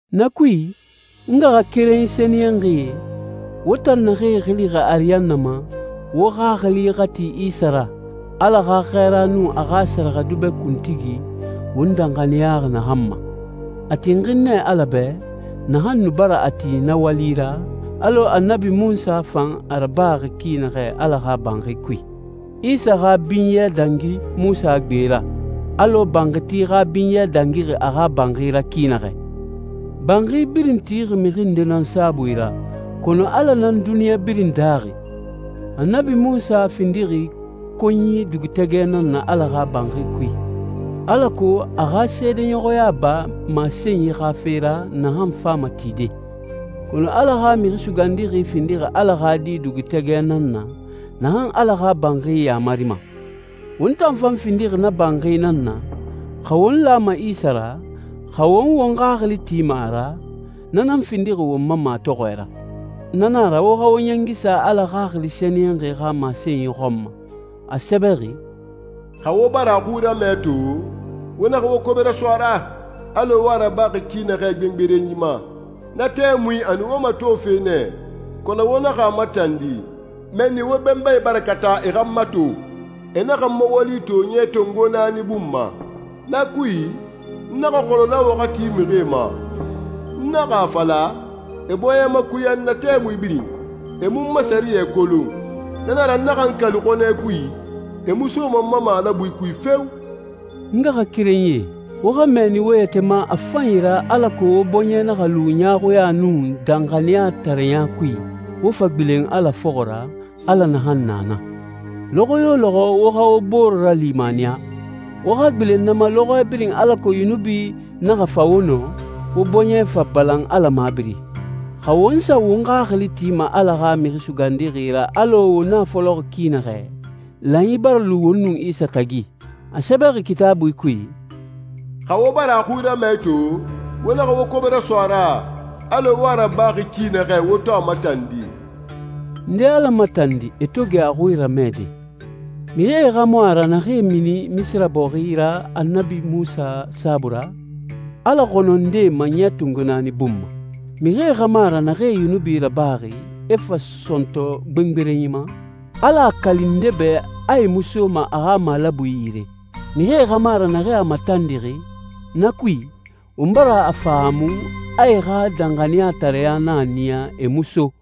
Na kui, n ngaxakerenyi sɛniyɛnxie, wo tan naxee xilixi ariyanna ma, wo xaxili xa ti Isa ra, Ala xa xɛɛra nun a xa sɛrɛxɛdubɛ kuntigi, won danxaniyaxi naxan ma. A tinxin nɛ Ala bɛ, naxan nu bara a ti na wali ra, alɔ Annabi Munsa fan a rabaxi ki naxɛ Ala xa banxi kui. Isa xa binyɛ dangi Munsa gbe ra, alɔ banxiti xa binyɛ dangixi a xa banxi ra ki naxɛ. Banxi birin tixi mixi nde nan saabui ra, kɔnɔ Ala nan duniɲa birin daaxi. Annabi Munsa findixi konyi dugutɛgɛ nan na Ala xa banxi kui, alako a xa seedeɲɔxɔya ba masenyi xa fe ra naxan fama tide. Kɔnɔ Ala xa Mixi Sugandixi findixi Ala xa Di dugutɛgɛ nan na, naxan Ala xa banxi yamarima. Won tan fan findixi na banxi nan na, xa won lama Isa ra, xa won won xaxili tima a ra, na nan findixi won ma matɔxɔɛ ra. Na na a ra, wo xa wo ɲɛngi sa Ala Xaxili Sɛniyɛnxi xa masenyi xɔn ma. A sɛbɛxi, «Xa wo bara a xui ramɛ to, wo naxa wo kobe raso a ra, alɔ wo a rabaxi ki naxɛ gbengberenyi ma. Na tɛmui a nu wo matofe nɛ, kɔnɔ wo naxa a matandi. Mɛnni wo benbae bara kata e xa n mato. E naxa n ma wali to ɲɛ tongo naani bun ma. Na kui, n naxa xɔnɔ na waxati mixie ma. N naxa a fala, ‹E bɔɲɛ makuya n na tɛmui birin, e mu n ma sɛriyɛ kolon.› Na na a ra n naxa n kali xɔnɛ kui, ‹E mu soma n ma malabui kui feo!›» N ngaxakerenyie, wo xa mɛɛni wo yɛtɛ ma a fanyi ra alako wo bɔɲɛ naxa lu ɲaaxuɲa nun danxaniyatareɲa kui, wo fa gbilen Ala fɔxɔ ra, Ala naxan na na. Lɔxɔ yo lɔxɔ wo xa wo bore ralimaniya. Wo xa gbilen na ma lɔxɔɛ birin alako yunubi naxa fa wo nɔ, wo bɔɲɛ fa balan Ala mabiri. Xa won sa won xaxili tima Ala xa Mixi Sugandixi ra alɔ won a fɔlɔxi ki naxɛ, lanyi bara lu won nun Isa tagi. A sɛbɛxi Kitaabui kui, «Xa wo bara a xui ramɛ to, wo naxa wo kobe raso a ra, alɔ wo a rabaxi ki naxɛ wo to a matandi.» Nde Ala matandi, e to gɛ a xui ramɛde? Mixie xa mu a ra naxee mini Misira bɔxi ra Annabi Munsa saabui ra? Ala xɔnɔ nɛ ndee ma ɲɛ tongo naani bun ma? Mixie xa mu a ra naxee yunubi rabaxi, e fa sɔntɔ gbengberenyi ma? Ala a kali nde bɛ a e mu soma a xa malabui yire? Mixie xa mu a ra naxee a matandixi? Na kui, won bara a fahaamu a e xa danxaniyatareɲa nan a niya e mu so.